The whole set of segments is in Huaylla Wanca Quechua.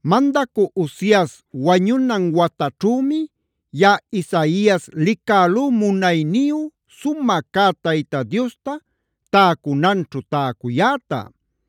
Mandacü Uzias wañunan wataćhümi, yaꞌa Isaias licälú munayniyu, sumä cä Tayta Diosta täcunanćhu täcuyäta.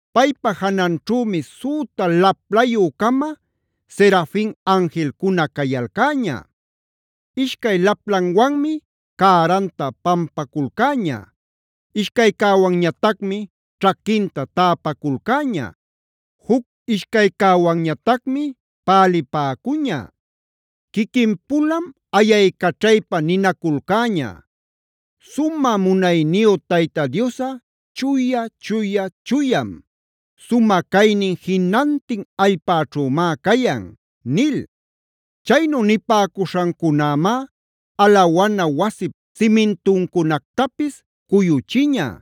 Paypa jananćhümi süta laplayü-cama Serafinb anjilcuna cayalcäña. Ishcay laplanwanmi cäranta pampaculcäña, ishcaycäwanñatacmi ćhaquinta täpaculcäña, juc ishcaycäwanñatacmi palipäcuña. Quiquin-pulam ayaycaćhaypa ninaculcäña: “¡Sumä munayniyu Tayta Diosꞌa chuya, chuya, chuyam! ¡Sumä caynin jinantin allpäćhümá cayan!” Chaynu nipäcuśhancunämá alawana wasip simintuncunactapis cuyuchiña;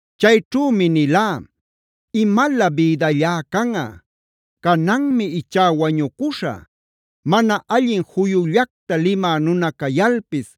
Chayćhümi nilá: “¡Imalä bïdallá canꞌa! ¡Cananmi ichá wañucuśhä! Mana allin juyullacta limä nuna cayalpis,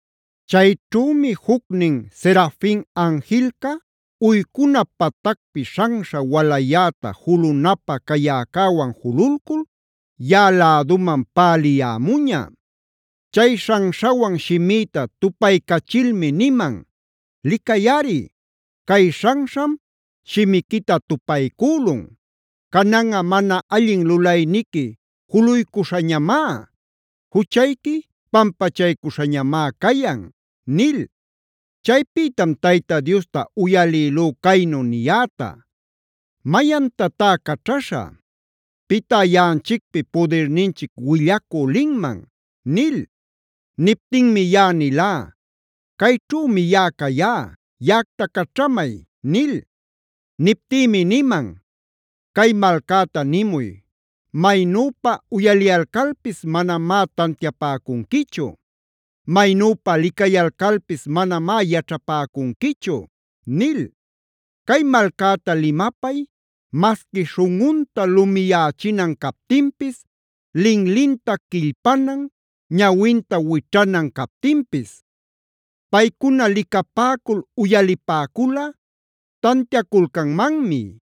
Chayćhümi jucnin Serafin anjilca, uycuna patacpi śhanśha walayäta julunapä cayäcäwan jululcul, yaꞌa läduman päliyämuña. Chay śhanśhawan shimïta tupaycachilmi niman: “Licayꞌari, cay śhanśham shimiquita tupaycülun. Cananꞌa mana allin lulayniqui juluycuśhañamá; juchayqui pampachaycuśhañamá cayan” nil. Chaypïtam Tayta Diosta uyalïlú caynu niyäta: “¿Mayantatá caćhaśhä? ¿Pitá yaꞌanchicpi pudirninchic willacü linman?” nil. Niptinmi yaꞌa nilá: “Cayćhümi yaꞌa cayá. Yaꞌacta caćhamay” nil. Niptïmi niman: “Cay malcäta nimuy: ‘Maynüpa uyaliyalcalpis manamá tantiapäcunquichu; maynüpa licayalcalpis manamá yaćhapäcunquichu’ nil. “Cay malcäta limapay masqui śhunꞌunta lumiyächinan captinpis, linlinta quillpanan, ñawinta wićhanan captinpis. Paycuna licapäcul, uyalipäculꞌa tantiaculcanmanmi.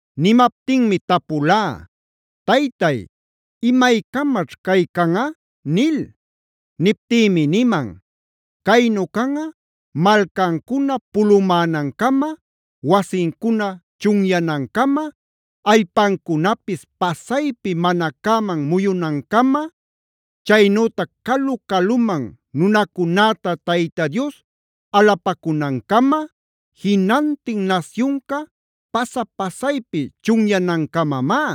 Nimaptinmi tapulá: “Taytay, ¿imaycamaćh cay canꞌa?” nil. Niptïmi niman: “Caynu canꞌa malcancuna pulumänancama, wasincuna chunyanancama, allpancunapis pasaypi mana cäman muyunancama, chaynütac calu-caluman nunacunäta Tayta Dios alapacunancama, jinantin nasyunca pasa-pasaypi chunyanancamamá.